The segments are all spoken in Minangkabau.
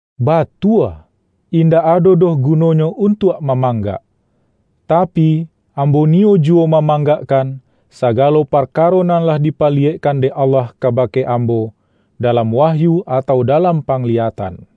Batua, indak ado doh guno-nyo untuak mamanggak. Tapi, ambo niyo juwo mamanggakkan, sagalo parkaro nan lah dipaliyekkan dek Allah kabake ambo, dalam wahyu atau dalam pangliyatan.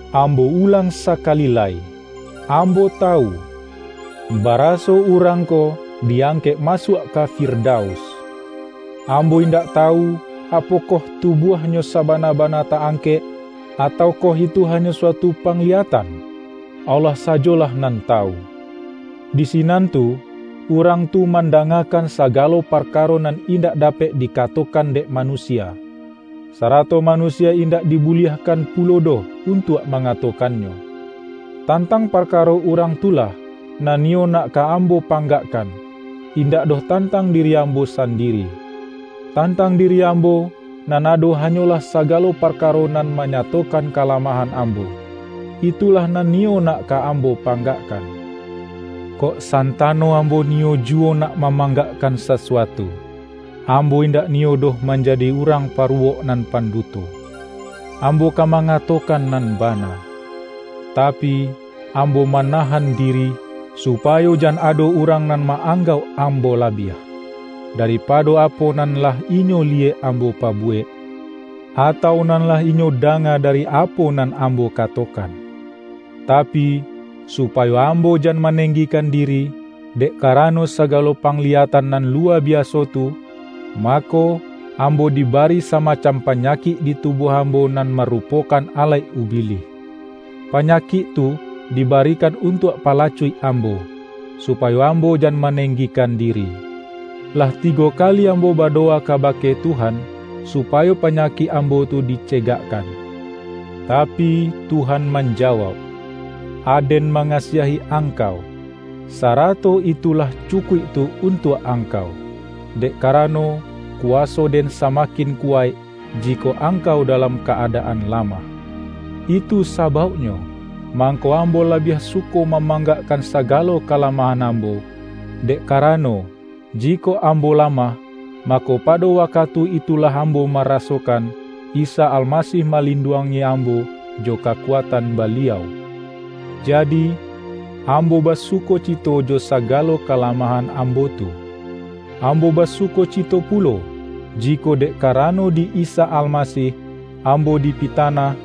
Ambo ulang sakali lai: Ambo tawu, baraso urang ko di angkek masuak ka Firda-us. (Ambo indak tawu, apokoh tubuah-nyo sabana-bana ta-angkek, atau koh itu hanyo suatu pangliyatan - Allah sajolah nan tawu.) Di sinan tu, urang tu mandangakan sagalo parkaro nan indak dapek dikatokan dek manusia, sarato manusia indak dibuliahkan pu-lo doh untuak mangatokannyo. Tan-tang parkaro urang tu lah, nan niyo nak ka ambo panggakkan, indak doh tantang diri ambo sandiri. Tantang diri ambo, nan ado hanyolah sagalo parkaro nan manyatokan kalamahan ambo, itulah nan niyo nak ka ambo panggakkan. Kok santano ambo ni-yo juwo nak mamanggakkan sasuatu, ambo indak niyo doh manjadi urang paruwok nan panduto; ambo ka ma-ngatokan nan bana. Tapi, ambo ma-nahan diri, supayo jan ado urang nan ma-anggauk ambo labiah, daripado apo nan lah inyo liyek ambo pabuwek, atau nan lah inyo danga dari apo nan ambo katokan. Tapi, supayo ambo jan manenggi-kan diri, dek karano sagalo pangliyatan nan luwa biaso tu, mako, ambo diba-ri samacam panyakik di tubuah am-bo nan marupokan alaik ubilih. Pa-nyakik tu dibarikan untuak palacuik ambo, supayo ambo jan manenggikan diri. Lah tigo kali ambo badowa ka-bake Tuhan, supayo panyakik ambo tu dicegakkan. Tapi, Tuhan manja-wauk,”Aden mangasiahi angkau, sa-rato itu lah cukuik tu untuak angkau; dek karano, kuwaso-Den samakin kuwaik, jikok angkau dalam ka-adaan lamah.” Itu sabauknyo, mangko am-bo labiah suko mamanggakkan saga-lo kalamahan ambo, dek karano, jikok ambo lamah, mako, pado wakatu itu-lah ambo marasokan, Isa Almasih ma-linduangi ambo jo kakuatan Baliau. Jadi, ambo basukocito jo sagalo ka-lamahan ambo tu. Ambo basukocito pulo, jikok dek karano di Isa Almasih, ambo dipitanah,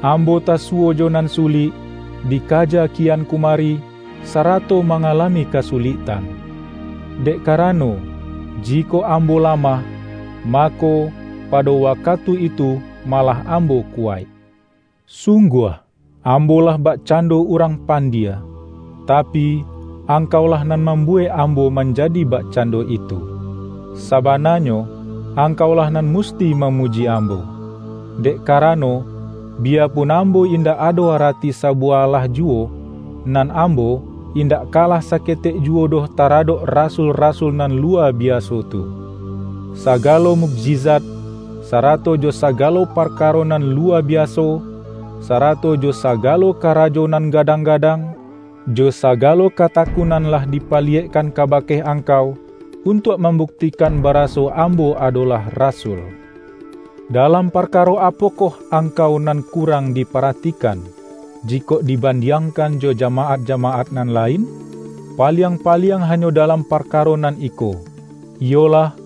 ambo tasuwo jo nan sulik, dikaja kian kumari, sarato ma-ngalami kasuliktan. Dek karano, ji-kok ambo lamah, mako, pado waka-tu itu malah ambo kuwaik. Sungguah, ambo lah bakcando urang pandie - tapi, angkaulah nan mambuwek ambo manjadi bakcando itu. Sabananyo, angkaulah nan mus-ti mamuji ambo. Dek karano, biyapun ambo indak ado arati sabuwah alah ju-wo, nan ambo, indak kalah saketek ju-wo doh taradok”rasul-rasul" nan luwa biaso tu! Sagalo mukjizat, sarato jo sagalo parkaro nan luwa biaso, sarato jo sagalo karajo nan gadang-gadang, jo sagalo katakunan lah dipaliyekkan kabake angkau, untuak mambuktikan baraso ambo adolah rasul. Dalam parkaro apokoh angkau nan kurang diparatikan, jikok dibandiangkan jo jamaat-jamaat nan lain? Paliang-pa-liang hanyo dalam parkaro nan iko: iyolah,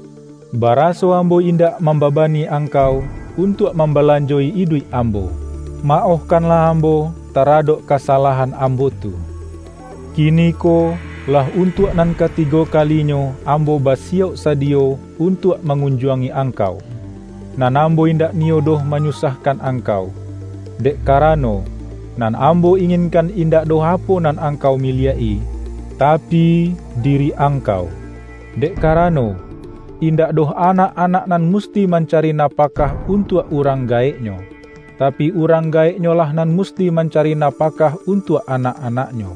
baraso ambo indak mamba-bani angkau, untuak mambalanjo-i iduik ambo. Maohkanlah ambo tara-dok kasalahan ambo tu! Kiniko, lah untuak nan katigo ka-linyo ambo basiyauk sadiyo untuak mangunjuangi angkau. Nan ambo in-dak niyo doh manyusahkan angkau, dek karano, nan ambo inginkan indak doh apo nan angkau miliak-i, tapi, diri angkau. Dek karano, indak doh anak-anak nan musti mancari napakah un-tuak urang gaeknyo, tapi, urang ga-eknyolah nan musti mancari napakah untuak anak-anaknyo.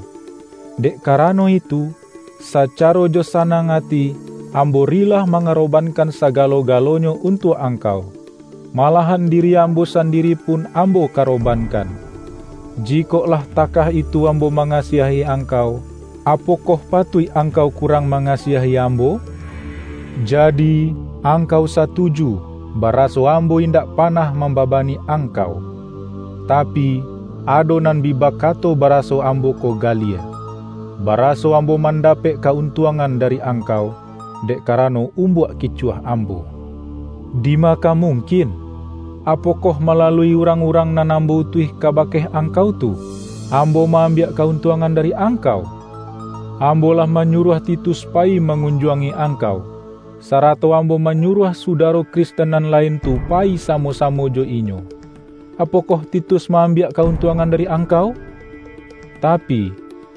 Dek karano itu, sacaro jo sanang ati ambo rilah mangarobankan sagalo-galonyo un-tuak angkau, malahan diri amho san-diri pun ambo karobankan. Jikok lah takah itu ambo mangasiahi angkau, apokoh patuik angkau kurang manga-siahi ambo? Jadi, angkau satuju baraso ambo indak panah mambabani angkau. Ta-pi, ado nan bi bakato baraso ambo ko galie; baraso ambo mandapek ka-un-tuangan dari angkau, dek karano um-buak kicuah ambo. Dima ka mung-kin! Apokoh malalui urang-urang nan ambo utuih kabake angkau tu, ambo ma-ambiak ka-untuangan dari ang-kau? Ambo lah manyuruah Titus pa-yi mangunjuangi angkau, sarato ambo manyuruah sudaro Kristen nan lain tu payi samo-samo jo inyo. Apokoh Titus ma-ambiak ka-untuangan dari ang-kau? Tapi,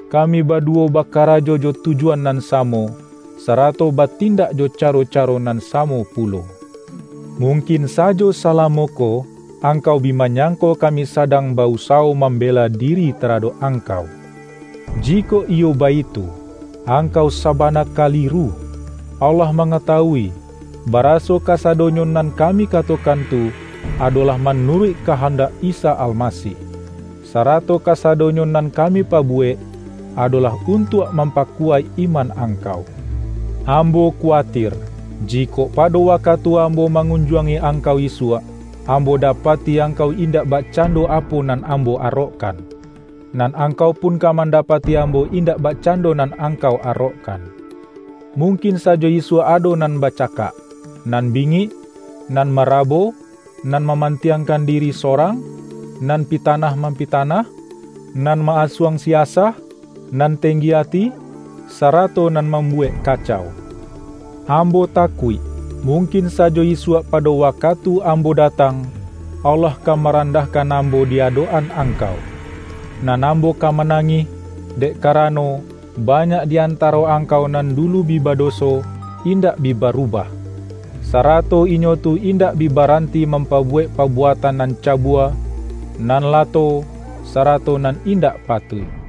kami baduwo bakarajo jo tujuan nan samo, sarato batindak jo caro-caro nan samo pulo! Mungkin sajo salamo ko, angkau bi manyangko kami sadang ba-usawo mambela diri taradok angkau. Jikok iyo baitu, angkau sabana kaliru! Allah mangatawui, baraso kasadonyo nan ka-mi katokan tu, adolah manuruik ka-handak Isa Almasih. Sarato kasado-nyo nan kami pabuwek, adolah untuak mampakuwaik iman angkau. Ambo kuwatir, jikok pado wakatu ambo ma-ngunjuangi angkau isuak, ambo dapati angkau indak bakcando apo nan ambo arokkan, nan angkau pun ka manda-pati ambo indak bakcando nan ang-kau arokkan. Mungkin sajo isuak ado nan bacakak, nan bingik, nan mara-bo, nan mamantiangkan diri sorang, nan pitanah-mampitanah, nan ma-asuang-siasah, nan tenggi ati, sarato nan mambuwek kacau. Ambo ta-kuik, mungkin sajo isuak pado wa-katu ambo datang, Allah ka maran-dahkan ambo di adok-an angkau, nan ambo ka manangih, dek karano, ba-nyak di antaro angkau nan dulu bi ba-doso, indak bi barubah, sarato inyo tu indak bi baranti mampabuwek pabu-atan nan cabua, nan lato, sarato nan indak patuik.